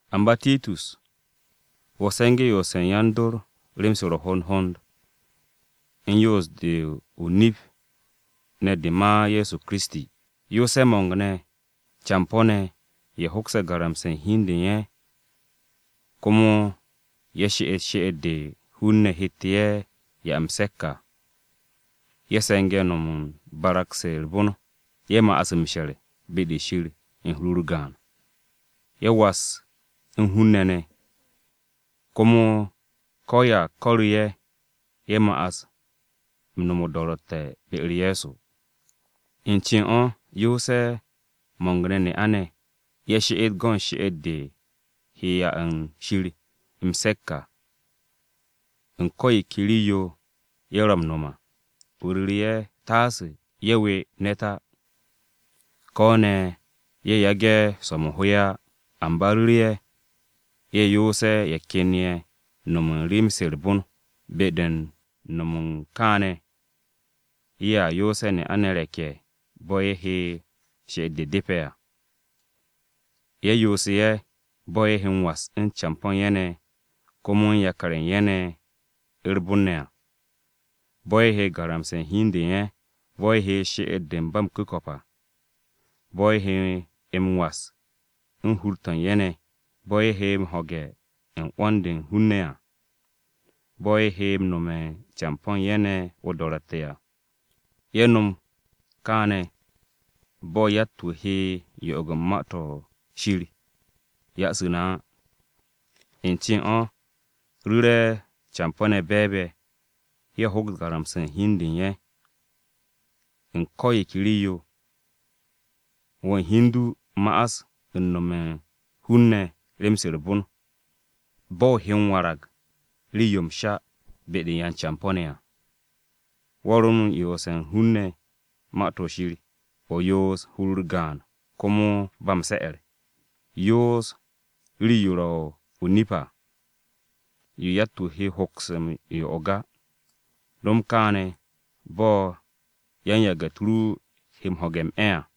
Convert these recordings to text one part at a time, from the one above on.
Amba Titus, wo̱ se̱nge̱ yoose̱ u̱n yan-dor rem-se ro̱ hond hond u̱n yoos-de o-nip ne̱ de ma Ye̱so Kiristi. Yoose̱ mo̱ng-ne̱ campo̱-ne̱ ye̱ hoks garamse̱ hi u̱n de u̱n ye̱. Komo ye̱ she'et she'et-de hun-ne̱ hette̱ ye̱ 'ya m-se̱k à, ye̱ se̱nge̱ no̱m u̱n barag-se u̱r-bon. Ye̱ ma'as m-she̱r be-de Shir u̱n hur-u̱r gaan, ye̱ was u̱n hun-ne̱ ne̱, komo ko̱ ya ko̱ru̱ ye̱, ye̱ ma'as u̱n no̱m o-do̱ro̱tte̱ be-u̱r Ye̱so. U̱n cen o̱ yoose̱ mo̱ng-ne̱ ne'a-ne̱, ye̱ she'et go̱n she'et-de he 'ya u̱n Shir m-se̱k à, u̱n ko̱ yo ke rii-yo ye̱ ro̱ m-no̱m à. O ru̱ru̱ ye̱ taase ye̱ we ne̱t á, ko̱ ne̱ ye̱ yage̱ swo̱-mo̱ ho ye̱ á. Amba ru̱ru̱ ye̱, ye̱ yoose̱ ye̱ ken ye̱ no̱m u̱n rem-se u̱r-bon. Be-de u̱n no̱m u̱n kaane̱, ye̱a yoose̱ ne'a-ne̱ re̱k-ye̱ bo̱ ye̱ he she'et-de depe̱ à. Ye̱ yoose̱ ye̱: Bo̱ ye̱ he m-was u̱n campo̱ u̱n ye̱ ne̱, komo u̱n yakar-ye̱ u̱n ye̱ ne̱ u̱r-bon ne̱ à. Bo̱ ye̱ he garamse̱ hi u̱n de u̱n ye̱, Bo̱ ye̱ he she'et-de u̱n ba m-ku̱ko̱p à, Bo̱ ye̱ he m-was u̱n hur-to̱ u̱n ye̱ ne̱, Bo̱ ye̱ he m-ho̱ge̱ u̱n 'wo̱n-de u̱n hun-ne̱ à, Bo̱ ye̱ he nome̱ u̱n campo̱ u̱n ye̱ ne̱ o-do̱ro̱tte̱ à. Ye̱ no̱m kaane̱ bo̱ yatt-wu̱ he yo'og u̱n Ma-to̱ Shir ya'asu̱ na á. U̱n cen o̱ ru̱re̱ campo̱-ne̱ be̱e̱b-ye̱, ye̱ hoks garamse̱ u̱n hi u̱n de u̱n ye̱ u̱n ko̱ yo ke rii-yo. Wo̱ u̱n hi u̱n du ma'as u̱n nome̱ u̱n hun-ne̱ rem-se u̱r-bon. Bo̱ o he warag rii-yo m-sha be-de u̱n yan-campo̱-ne̱ à. Wo̱ ro u̱n yoose̱ u̱n hun-ne̱ Ma-to̱ Shir, o yoos u̱n hur-u̱r gaan komo ba m-se̱'e̱r. Yoos rii-yo ro̱ o-nip à, yo yatt-wu̱ he hoks m-yo'og á. No̱m kaane̱ bo̱ yan-yage̱-u̱t ru he m-ho̱ge̱ m-'e̱ à,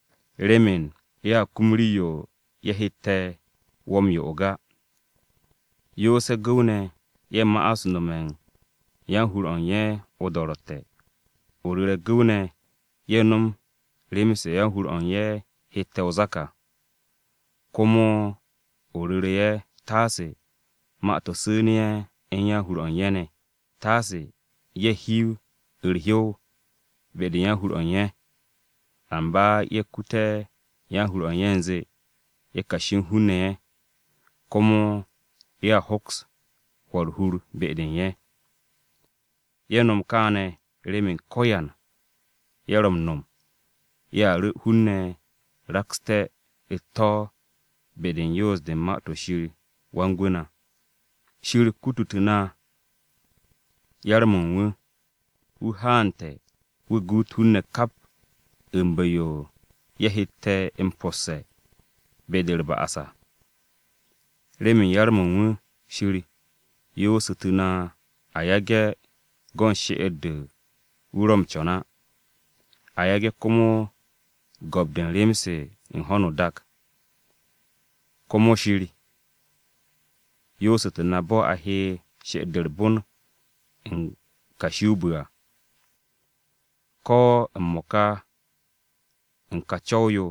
remen ye̱a kum rii-yo ye̱ hette̱ wo̱ m-yo'og á. Yoose̱ gu̱w-ne̱ ye̱ ma'as nome̱ u̱n yan-hur-o̱ u̱n ye̱ o-do̱ro̱tte̱. O ru̱re̱ gu̱w-ne̱, ye̱ nom rem-se yan-hur-o̱ u̱n ye̱ hette̱ o-zak à. Komo o ru̱re̱ ye̱ taase ma-to̱ su̱u̱ne̱ ye̱ u̱n yan-hur-o̱ u̱n ye̱ ne̱. Taase ye̱ hiw u̱r-hyow be-de u̱n yan-hur-o̱ u̱n ye̱. Amba ye̱ kute̱ yan-hur-o̱ u̱n ye̱ u̱nze ye̱ kashi u̱n hun-ne̱ ye̱, komo ye̱a hoks hwo̱ u̱r-hur be-de u̱n ye̱. Ye̱ nom kaane̱ remen ko̱yan ye̱ ro̱ m-no̱m ye̱a ru̱ hun-ne̱ rakste̱ u̱t-to̱ be-de u̱n yoos-de u̱n Ma-to̱ Shir Wan-Gwu̱ na. Shir kututu̱ na yar-mo̱ u̱n wu̱, wu̱ haante̱ wu̱ guut hun-ne̱ kap u̱n bu̱-yo ye̱ hette̱ m-posse̱ be-de u̱r-ba'as à. Remen yar-mo̱ u̱n wu̱, Shir yoosu̱tu̱ na a yage̱ go̱n she'et-de wu̱ ro̱ m-co̱n á, a yage̱ komo go̱p-de u̱n rem-se u̱n ho̱no o-dak. Komo Shir yoosu̱tu̱ na bo̱ a he she'et-de u̱r-bon u̱n kashi o-bu̱ à, ko̱ m-mo̱ka u̱n ka co̱w-yo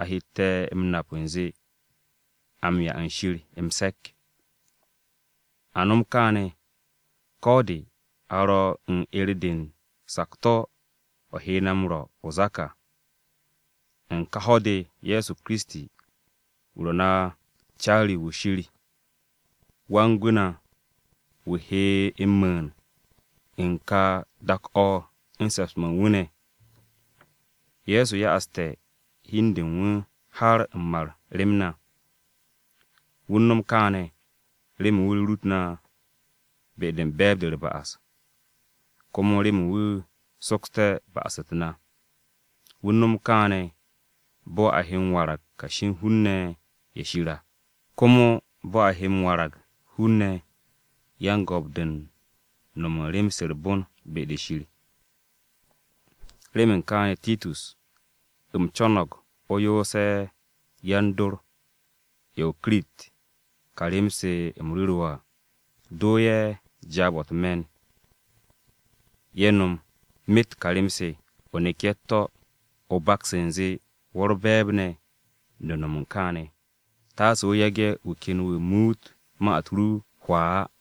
a hette̱ m-nap u̱nze a m-'ya u̱n Shir m-se̱k. A nom kaane̱, ko̱ de a ro̱ u̱n 'er-de u̱n sakto̱, o̱ he na m-rwo̱ o-zak à. U̱n ka ho̱-de Ye̱so Kiristi, wu̱ ro̱ na caari-wu̱ Shir, Wan-Gwu̱ na, wu̱ he m-mu̱u̱n u̱n ka dak-o̱ u̱n se̱ps-mo̱ u̱n wu̱ ne̱. Ye̱so ya'aste̱ hi u̱n de u̱n wu̱ har m-mar rem na. Wu̱ u̱n no̱m kaane̱, remen wu̱ rurut na be-de u̱n be̱e̱b-de u̱r-ba'as, komo remen wu̱ soksté̱ ba'as-u̱t na. Wu̱ u̱n no̱m kaane̱ bo̱ a he m-warag kashi u̱n hun-ne̱ ye̱ u̱n Shir à, komo bo̱ a he m-warag hun-ne̱ yan-go̱p-de u̱n no̱m u̱n rem-se u̱r-bon be-de Shir. Remen kaane̱ Titus, u̱m co̱no̱g o yoose̱ yan-dor ye̱ u̱n o-Kirit ka rem-se u̱m ru̱ru̱ wo̱ à. Do ye̱ jaab-o̱ u̱t-me̱n ye̱ no̱m myet ka rem-se, o nek ye̱ u̱t-to̱, o baks u̱nze wo̱ u̱r-be̱e̱b ne̱ de u̱n no̱m u̱n kaane̱. Taase o yage̱ wu̱ ken wu̱ muut ma-u̱t ru hwaa á.